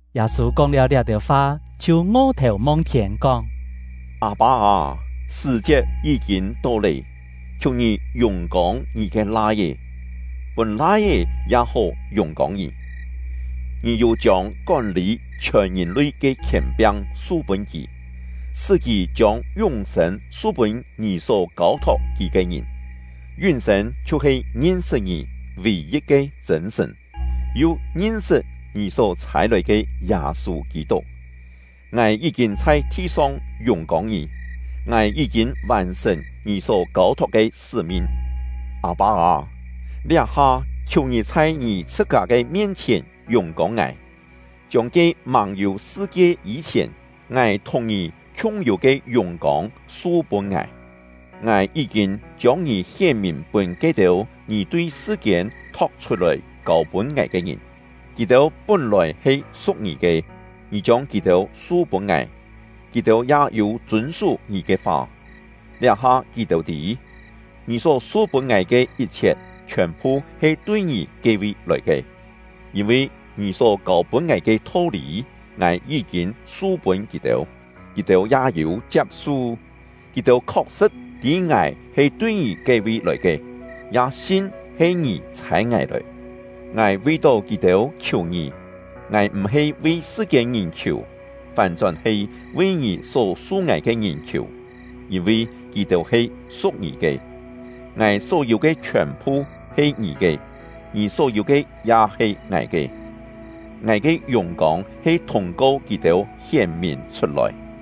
Yâ-sû kóng-liáu liá-têu fa, chhiu ngo-thèu mong-thiên, kóng: “Â-pâ â, sṳ̀-chiet yí-kîn to lé, khiù Ngì yùng-kông Ngì ke Lai-é, pûn Lai-é ya hó yùng-kông Ngì. Ngì yû chiông kón-lî chhiòn ngìn-lui ke khièn-piang su-pûn kì, sṳ́ kì chiông yún-sên su-pûn Ngì só kâu-thok kì ke ngìn. Yún-sên chhiu-he ngin-sṳt Ngì — vì-yit ke chṳ̂n Sṳ̀n, yu ngin-sṳt Ngì só chhâi-lòi ke Yâ-sû Kî-tuk. Ngài yí-kîn chhai thi-song yùng-kông Ngì; ngài yí-kîn vàn-sṳ̀n Ngì só kâu-thok ke sṳ́-min. Â-pâ â, liá-ha khiù Ngì chhai Ngì chhṳ-kâ ke mien-chhièn yùng-kông ngài, chiông ke màng-yû sṳ-kie yî-chhièn, ngài thùng Ngì khiung-yû ke yùng-kông su-pûn ngài! “Ngài yí-kîn chiông Ngì hién-mìn pûn ke-têu Ngì tui sṳ-kiên tho̍k-chhut-lòi kâu-pûn ngài ke ngìn. Kì-têu pún-lòi he su̍k Ngì ke, Ngì chiông kì-têu su-pûn ngài; kì-têu ya yû chûn-sú Ngì ke fa. Liá-ha kì-têu tî, Ngì só su-pûn ngài ke yit-chhiet, chhiòn-phu he tui Ngì ke-vi lòi ke; yîn-vi Ngì só kâu-pûn ngài ke tho-lî, ngài yí-kîn su-pûn kì-têu, kì-têu ya yû chiap-su. Kì-têu khok-sṳ̍t tî ngài he tui Ngì ke-vi lòi ke, ya sin he Ngì chhâi ngài lòi. “Ngài vi-tó kì-têu khiù Ngì. Ngài m̀-he vi sṳ-kiên-ngìn khiù, fán-chón he vi Ngì só su ngài ke ngìn khiù, yîn-vi kì-têu he su̍k Ngì ke. Ngài só-yû ke chhiòn-phu he Ngì ke, Ngì só-yû ke ya he ngài ke; ngài ke yùng-kông he thûng-ko kì-têu hién-mìn chhut-lòi.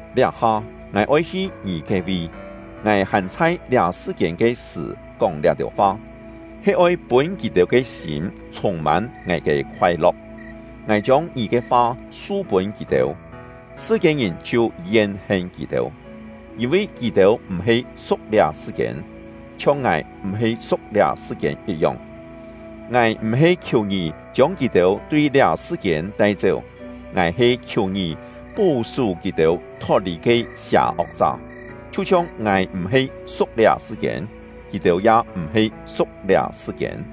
Liá-ha, ngài oi hi Ngì ke-vi; ngài hàn chhai liá sṳ-kiên ke sṳ̀ kóng liá-têu fa, he oi pûn kì-têu ke sîm chhûng-mân ngài ke khoai-lo̍k. Ngài chiông Ngì ke fa su-pûn kì-têu; sṳ-kiên-ngìn chhiu yen-hen kì-têu, yîn-vi kì-têu m̀-he su̍k liá sṳ-kiên, chhiong ngài m̀-he su̍k liá sṳ-kiên yit-yong. Ngài m̀-he khiù Ngì chiông kì-têu tui liá sṳ-kiên tai-chéu, ngài he khiù Ngì pó-sú kì-têu thot-lì ke sià-ok-chá. Chhiu-chhiong ngài m̀-he su̍k liá sṳ-kiên, kì-têu ya m̀-he su̍k liá sṳ-kiên.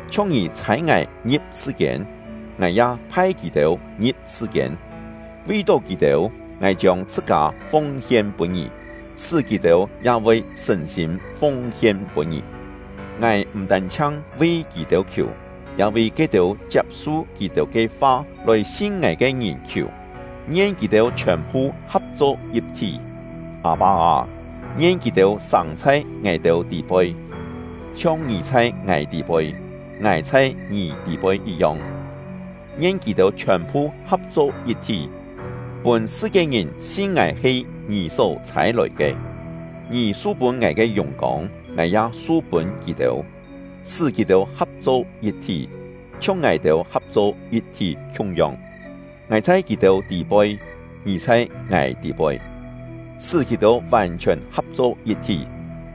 Chhiong Ngì chhâi ngài ngi̍p sṳ-kiên, ngài ya phai kì-têu ngi̍p sṳ-kiên. Vi-tó kì-têu, ngài chiông chhṳ-kâ fung-hien pûn Ngì, sṳ́ kì-têu ya voi sṳ̀n-sîm fung-hien pûn Ngì. “Ngài m̀ tân-chhiang vi kì-têu khiù, ya vi ke-têu chiap-su kì-têu ke fa lòi sin ngài ke ngìn khiù. Ngien kì-têu chhiòn-phu ha̍p-cho yit-thí. Â-pâ â, ngien kì-têu sâng chhai ngài-têu tî-poi, chhiong Ngì chhai ngài tî-poi, ngài chhai Ngì tî-poi yit-yong. Ngien kì-têu chhiòn-phu ha̍p-cho yit-thí, pûn sṳ-kiên-ngìn sin ngài he Ngì só chhâi-lòi ke. Ngì su-pûn ngài ke yùng-kông, ngài ya su-pûn kì-têu, sṳ́ kì-têu ha̍p-cho yit-thí, chhiong ngài-têu ha̍p-cho yit-thí khiung-yong. Ngài chhai kì-têu tî-poi, Ngì chhai ngài tî-poi, sṳ́ kì-têu vàn-chhiòn ha̍p-cho yit-thí,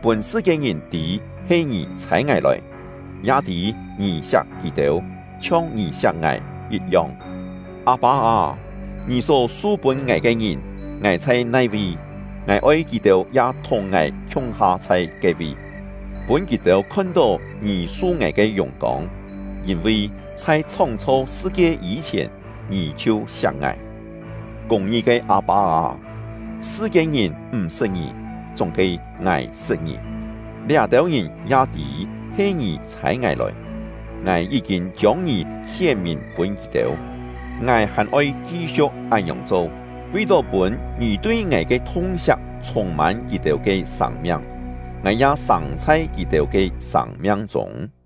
pûn sṳ-kiên-ngìn tî he Ngì chhâi ngài lòi, ya tî Ngì siak kì-têu, chhiong Ngì siak ngài yit-yong. “Â-pâ â, Ngì só su-pûn ngài ke ngìn, ngài chhai nai-vi, ngài oi kì-têu ya thùng ngài khiung-ha chhai ke-vi, pûn kì-têu khon-tó Ngì su ngài ke yùng-kông; yîn-vi chhai chhóng-chho sṳ-kie yî-chhièn, Ngì chhiu siak ngài. Kûng-ngi ke Â-pâ â, sṳ-kiên-ngìn m̀ sṳt Ngì, chúng-he ngài sṳt Ngì; liá-têu ngìn ya tî he Ngì chhâi ngài lòi. Ngài yí-kîn chiông Ngì hién-mìn pûn kì-têu; ngài hàn oi ki-siu̍k án-ngiòng cho, vi-tó pûn Ngì tui ngài ke thung-siak chhûng-mân kì-têu ke sâng-miang, ngài ya sâng chhai kì-têu ke sâng-miang chûng.”